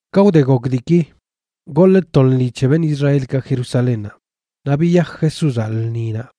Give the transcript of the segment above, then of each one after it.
Ka wde gok diiki, goḻꞌ to lṉi c̱he beṉꞌ Israelkaꞌ Jerusalénnaꞌ, naꞌ biyaj Jesúzaꞌ lṉinaꞌ.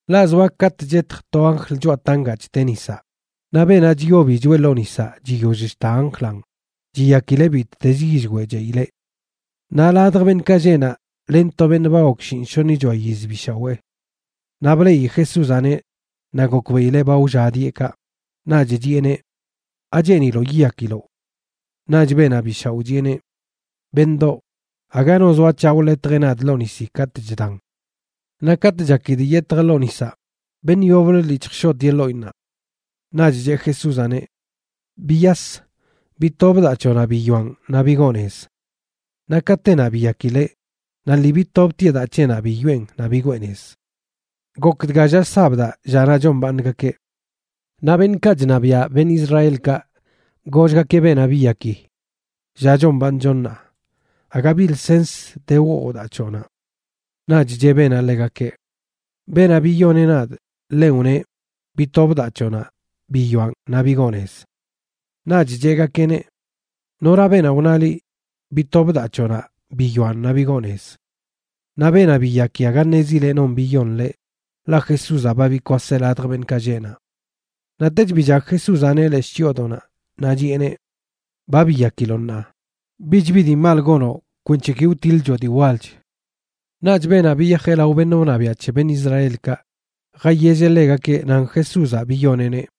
Ḻaꞌ zoa katꞌ chetj to anjl choꞌa tangaꞌ chteꞌ nisaꞌ, naꞌ beenaꞌ chyobi choꞌe ḻoo nisaꞌ chiyoll chta anjlaꞌn chiyakileꞌ bittezə yillweꞌ cheꞌileꞌ. Naꞌ ladj beṉꞌkaꞌ lleꞌ naꞌ len to beṉꞌ ba gok shinꞌshoṉichoa yiz bi shawee. Naꞌ bleꞌi Jesúzaꞌneꞌ naꞌ gokbeꞌileꞌ ba wlla dieꞌ kaꞌ, naꞌch chiꞌeneꞌ: ―¿Acheeniloꞌ yiyakiloꞌ? Naꞌch beenaꞌ bi shaoꞌ chiꞌeneꞌ: ―Beṉꞌdoꞌ, aga no zoa c̱haꞌ wḻetjeꞌ nadꞌ ḻoo nisi katꞌ chdan. Naꞌ katꞌ chakidꞌ yetjꞌ ḻoo nisaꞌ, beṉꞌ yoblə lii chjshoꞌtieꞌ ḻoꞌinnaꞌ. Naꞌch cheꞌ Jesúzaꞌneꞌ: ―Biyas, bitob daa c̱hoꞌnaꞌ biyoaꞌn naꞌ bigoo nez. Naꞌ katenaꞌ biyakileꞌ naꞌ lii bitobtieꞌ daa c̱heꞌnaꞌ biyoꞌen naꞌ bigwee nez. Gok dga lla sabdaꞌ, llanaꞌ chombaaṉgakeꞌ. Naꞌ beṉꞌkaꞌ chṉabiaꞌ beṉꞌ Israelkaꞌ gollgakeꞌ beenaꞌ biyaki: ―Lla chombaaṉcho ṉaa. Aga bi lsens de woo daa c̱hoꞌnaꞌ. Naꞌch cheꞌ beenaꞌ ḻegakeꞌ: ―Beenaꞌ biyoneꞌ nadꞌ ḻenꞌ wneꞌ: “Bitob daa c̱hoꞌnaꞌ biyoaꞌn naꞌ bigoo nez.” Naꞌch cheꞌgakeꞌneꞌ: ―¿Nora beenaꞌ wna liꞌ: “Bitob daa c̱hoꞌnaꞌ biyoaꞌn naꞌ bigoo nez”? Naꞌ beenaꞌ biyaki aga ṉezileꞌ non biyon ḻeꞌ, ḻaꞌ Jesúzaꞌ ba bikwaseꞌ ladj beṉꞌkaꞌ lleꞌ naꞌ. Naꞌtech billag Jesúzaꞌneꞌ leshꞌ chyoodoꞌnaꞌ, naꞌ chiꞌeneꞌ: ―Ba biyakiloꞌ ṉaa. Bich bi dii mal gonoꞌ kwenc̱he ki wtiḻchoꞌ dii walch. Naꞌch beenaꞌ biyajeꞌ lao beṉꞌ wṉabiaꞌ c̱he beṉꞌ Israelkaꞌ jayelleꞌ ḻegakeꞌ nan Jesúzaꞌ biyoneꞌneꞌ.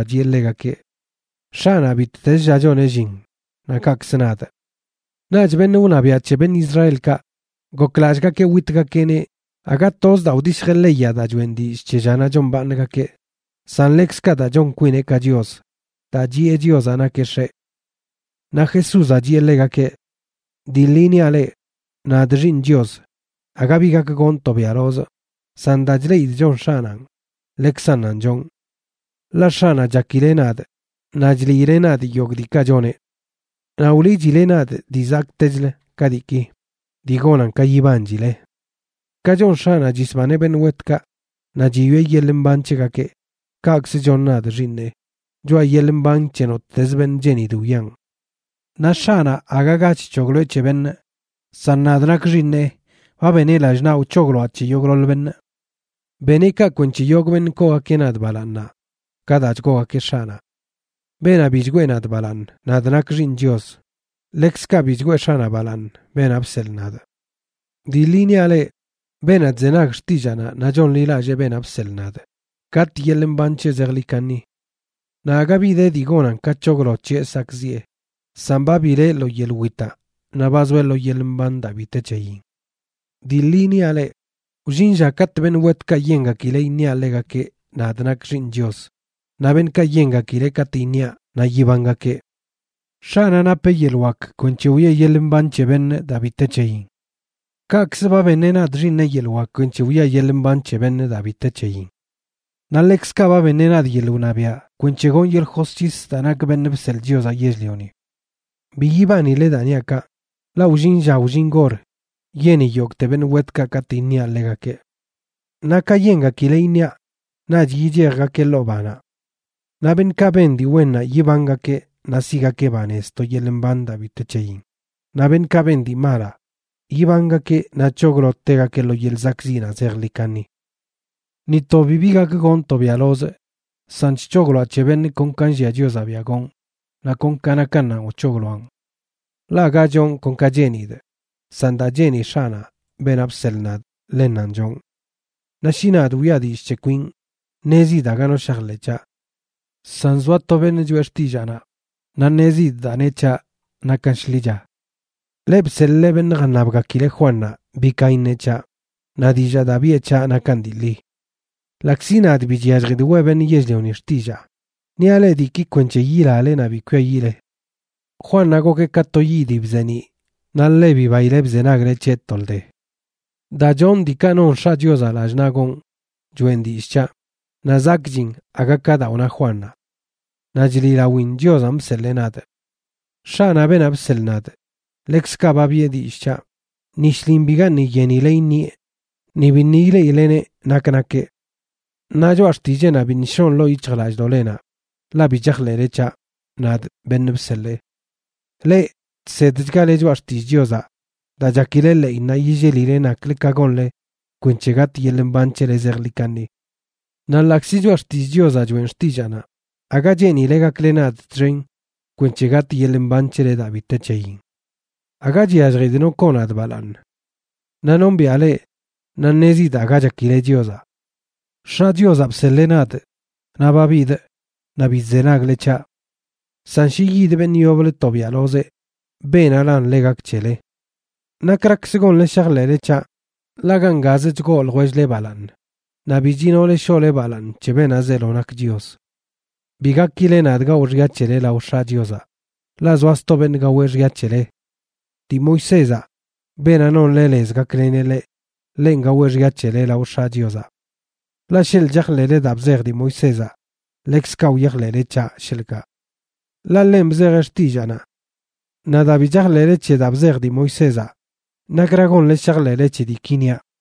Naꞌ Jesúzaꞌ chiꞌe ḻegakeꞌ: ―X̱aꞌnaꞌ bittezə lla choneꞌ llin naꞌ kaꞌkzə nadꞌ. Naꞌch beṉꞌ wṉabiaꞌ c̱he beṉꞌ Israelkaꞌ goklallꞌgakeꞌ witgakeꞌneꞌ aga toz daa wdishjeꞌ leyaꞌ daa choꞌen dillꞌ c̱he llanaꞌ chombaaṉgakeꞌ, san ḻekzkaꞌ daa chon kwineꞌ ka Chios daa chiꞌe Chiozaꞌ nakeꞌ X̱eꞌ. Naꞌ Jesúzaꞌ chiꞌe ḻegakeꞌ: ―Dii ḻi niaꞌ leꞌ, nadꞌ, Xiiṉ Chios, aga bi gak gonꞌ tobiaꞌlozꞌ, san daa chleꞌidꞌ chon X̱aꞌnanꞌ ḻekzannanꞌ chonꞌ. Ḻaꞌ X̱aꞌnaꞌ chakileꞌ nadꞌ naꞌ chliileꞌ nadꞌ yogꞌ diikaꞌ choneꞌ. Naꞌ wliꞌchileꞌ nadꞌ dii zakꞌtechlə ka diiki, dii gonan ka yibanchile. Ka chon X̱aꞌnaꞌ chisbaneꞌ beṉꞌ wetkaꞌ naꞌ chiyoꞌe yeḻꞌ mban c̱hegakeꞌ, kaꞌkzə chon nadꞌ, Xiiṉeꞌ, choꞌa yeḻꞌ mban c̱he nottezə beṉꞌ cheenidꞌ wiꞌan. Naꞌ X̱aꞌnaꞌ aga ga chc̱hogloeꞌ c̱he beṉꞌ, san nadꞌ nakꞌ Xiiṉeꞌ, ba beneꞌ lallꞌ naꞌ wc̱hogloaꞌ c̱he yogꞌḻoḻ beṉꞌ. Beneꞌ kaꞌ kwenc̱he yogꞌ beṉꞌ koogakeꞌ nadꞌ balaaṉnaꞌ ka daa chgoogakeꞌ X̱aꞌnaꞌ. Beenaꞌ bi chgwee nadꞌ balaaṉ, nadꞌ nakꞌ Xiiṉ Chios, ḻekzkaꞌ bi chgwee X̱aꞌnaꞌ balaaṉ, beenaꞌ bseḻꞌ nadꞌ. ’Dii ḻi niaꞌ leꞌ, beenaꞌ chzenag xtillaanaꞌ naꞌ chonḻilallee beenaꞌ bseḻꞌ nadꞌ, gatꞌ yeḻꞌ mban c̱heꞌ zejḻi kaṉi. Naꞌ aga bi de dii gonan ka c̱hoglo c̱heꞌ sakꞌziꞌe, san ba bileꞌ lo yeḻꞌ witaꞌ naꞌ ba zoeꞌ lo yeḻꞌ mban daa bi te c̱heyin. Dii ḻi niaꞌ leꞌ, wllin lla katꞌ beṉꞌ wetkaꞌ yengakileꞌ iṉiaꞌ ḻegakeꞌ, nadꞌ nakꞌ Xiiṉ Chios, naꞌ beṉꞌkaꞌ yengakileꞌ katꞌ iṉiaꞌ naꞌ yibangakeꞌ. X̱aꞌnaꞌ napeꞌ yeḻꞌ wak kwenc̱he wiꞌe yeḻꞌ mban c̱he beṉꞌ daa bi te c̱heyin. Kaꞌkzə ba beṉeꞌ nadꞌ Xiiṉeꞌ yeḻꞌ wak kwenc̱he wiꞌa yeḻꞌ mban c̱he beṉꞌ daa bi te c̱heyin. Naꞌ ḻekzkaꞌ ba beṉeꞌ nadꞌ yeḻꞌ wṉabiaꞌ kwenc̱he gonꞌ yeḻꞌ josc̱his daa nakꞌ Beṉꞌ Bseḻꞌ Chiozaꞌ Yell-lioni. Bi yibanile daa niaꞌ kaꞌ, ḻaꞌ wllin lla wllin gor yeni yogꞌte beṉꞌ wetkaꞌ katꞌ iṉiaꞌ ḻegakeꞌ. Naꞌ ka yengakileꞌ iṉiaꞌ naꞌch yichejgakeꞌ ḻoo banaꞌ. Naꞌ beṉꞌkaꞌ ben dii wennaꞌ yibangakeꞌ naꞌ siꞌgakeꞌ banez to yeḻꞌ mban daa bi te c̱heyin, naꞌ beṉꞌkaꞌ ben dii malaꞌ, yibangakeꞌ naꞌ c̱hoglo tegakeꞌ lo yeḻꞌ zakꞌziꞌnaꞌ zejḻi kaṉi. ’Ni to bibi gak gonꞌ tobiaꞌlozꞌ, san chc̱hogloaꞌ c̱he beṉꞌ kon ka nllia Chiozaꞌ biaꞌ gonꞌ, naꞌ kon ka nakannanꞌ wc̱hogloaꞌn. Ḻaꞌ aga chonꞌ kon ka cheenidꞌ, san daa cheeni X̱aꞌnaꞌ, beenaꞌ bseḻꞌ nadꞌ, ḻennanꞌ chonꞌ. Naꞌ shi nadꞌ wiꞌa dillꞌ c̱he kwinꞌ, ṉezidꞌ aga no shajḻeꞌ c̱haꞌ. San zoa to beṉꞌ choꞌe xtillaanaꞌ, naꞌ ṉezidꞌ daa neꞌ c̱haꞌ nakan shḻicha. Leꞌ bseḻꞌle beṉꞌ jaṉabgakileꞌ Juannaꞌ bi ka iṉeꞌ c̱haꞌ, naꞌ dillaa daa biꞌe c̱haꞌ nakan dii ḻi. Ḻaꞌkzi nadꞌ bi chyalljidꞌ weꞌ beṉꞌ yell-lioni xtillaa; niaꞌ leꞌ diiki kwenc̱he yilale naꞌ bi kwiayiꞌle. Juannaꞌ gokeꞌ ka to yiꞌ dii bzeeniꞌ naꞌ ḻe bibaile bzenagle c̱heꞌ tolde. Daa chonꞌ diikaꞌ non X̱aꞌ Chiozaꞌ lallꞌ naꞌ gonꞌ choeꞌn dillꞌ c̱haꞌ, naꞌ zakꞌchin aga ka daa wna Juannaꞌ. Naꞌ chliꞌlawin Chiozanꞌ bseḻee nadꞌ. X̱aꞌnaꞌ, beenaꞌ bseḻꞌ nadꞌ, ḻekzkaꞌ ba biꞌe dillꞌ c̱haꞌ. Ni shlin bigaṉꞌ yenile iṉieꞌ ni biṉꞌ ileꞌileneꞌ nak nakeꞌ. Naꞌ choꞌa xtilleenaꞌ biṉꞌ shoꞌn ḻoo yic̱hjlallꞌdoꞌlenaꞌ, ḻaꞌ bi chajḻeꞌle c̱haꞌ, nadꞌ beṉꞌ bseḻee. Leꞌ chsedchgale Choꞌa Xtillꞌ Chiozaꞌ daa chakile ḻeꞌinnaꞌ yillelile naklə ka gonle kwenc̱he gatꞌ yeḻꞌ mban c̱hele zejḻi kaṉi. Naꞌ ḻaꞌkzi Choꞌa Xtillꞌ Chiozaꞌ choeꞌn xtillaanaꞌ, aga cheenile gakle nadꞌ txen kwenc̱he gatꞌ yeḻꞌ mban c̱hele daa bi te c̱heyin. ’Aga chyalljidꞌ no koo nadꞌ balaaṉ. Naꞌ nombiaꞌ leꞌ, naꞌ ṉezidꞌ aga chakile Chiozaꞌ. X̱aꞌ Chiozaꞌ bseḻee nadꞌ naꞌ ba bidꞌ, naꞌ bi chzenagle c̱haꞌ. San shi yid beṉꞌ yoblə tobiaꞌlozeꞌ, beenaꞌlan ḻe gak c̱hele. ¿Nakrakzə gonle shajḻeꞌle c̱haꞌ? Ḻaꞌ gangazə chgoo ljwell-le balaaṉ, naꞌ bi chinole shoꞌle balaaṉ c̱he beenaꞌ zeelo nak Chios. Bi gakile nadꞌ gawꞌ xya c̱hele lao X̱aꞌ Chiozaꞌ, ḻaꞌ zoa sto beṉꞌ gaweꞌ xya c̱hele. Dii Moisézaꞌ, beenaꞌ nonle lez gakleneꞌ leꞌ, ḻenꞌ gaweꞌ xya c̱hele lao X̱aꞌ Chiozaꞌ. Ḻaꞌ sheḻꞌ chajḻeꞌle daa bzej dii Moisézaꞌ, ḻekzkaꞌ wyajḻeꞌle c̱haꞌ, sheḻꞌkaꞌ. Ḻaꞌ ḻenꞌ bzejeꞌ xtillaanaꞌ. Naꞌ daa bi chajḻeꞌle c̱he daa bzej dii Moisézaꞌ, ¿nakra gonle shajḻeꞌle c̱he diiki niaꞌ?